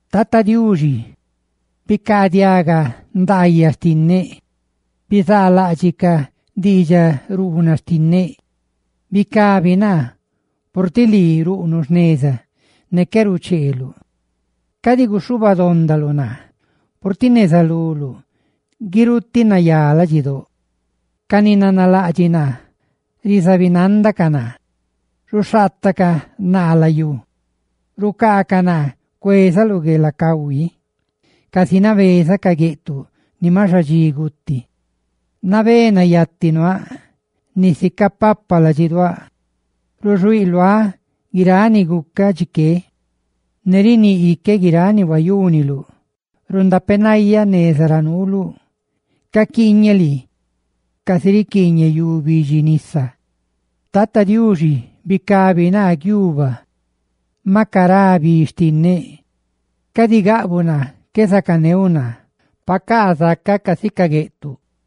Tata Diuxi, bicaadiaga ndaayaꞌ xtinneꞌ; bizaalaꞌdxiꞌ ca diidxaruunaꞌ xtinneꞌ. ¡Bicabi naa, purtiꞌ lii ruꞌnuꞌ jneza ne qué rucheeluꞌ! Cadi guxhubadondaluꞌ naa, purtiꞌ neza luluꞌ guirutiꞌ nayá ladxidóꞌ. Ca ni nanalaꞌdxiꞌ naa rizabinandacaꞌ naa, ruxhaatacaꞌ naa layú; cucaacaꞌ naa cuezaꞌ lu guelacahui, casi nabeza ca gueꞌtuꞌ ni maꞌ xadxi guti. Nabé nayati nuaaꞌ; nisi capapa ladxiduáꞌ. Ruxuíꞌ luáꞌ guiráꞌ ni gucaꞌ dxi que, ne riníꞌ iqueꞌ guiráꞌ ni huayúniluꞌ. Rundapenayáꞌ neza ra nuuluꞌ, caquiiñeꞌ lii, casi rinabaꞌ yu bidxi nisa. Tata Diuxi, ¡bicabi naa guiuba, maꞌ cará bi xtinneꞌ! Cadi gaꞌbuꞌ naa qué zacaneuꞌ naa, pacaa zacaꞌ casi ca gueꞌtuꞌ.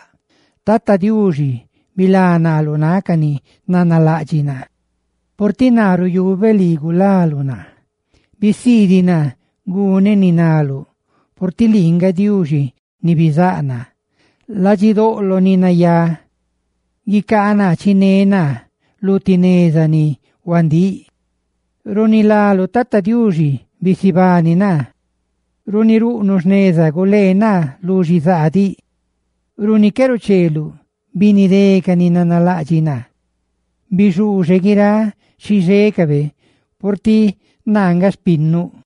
Bilá naa, Tata Diuxi, lu náꞌ ca ni nanalaꞌdxiꞌ naa, purtiꞌ naa ruyubeꞌ lii gulaluꞌ naa. Bisiidiꞌ naa guneꞌ ni naluꞌ, purtiꞌ lii nga Diuxi ni bizáꞌ naa. ¡Xhieꞌdoꞌ ni nayá xtiuꞌ chiné naa lu ti neza ni huandíꞌ! Runi láluꞌ, Tata Diuxi, ¡bisibani naa! Tí lii ruꞌnuꞌ jneza, ¡gulee naa lu xizaa! Runi qué rucheeluꞌ, ¡binidé ca ni nanalaꞌdxiꞌ naa! ¡bixuuxe guiráꞌ xixécabe, purtiꞌ naa nga xpinnuꞌ!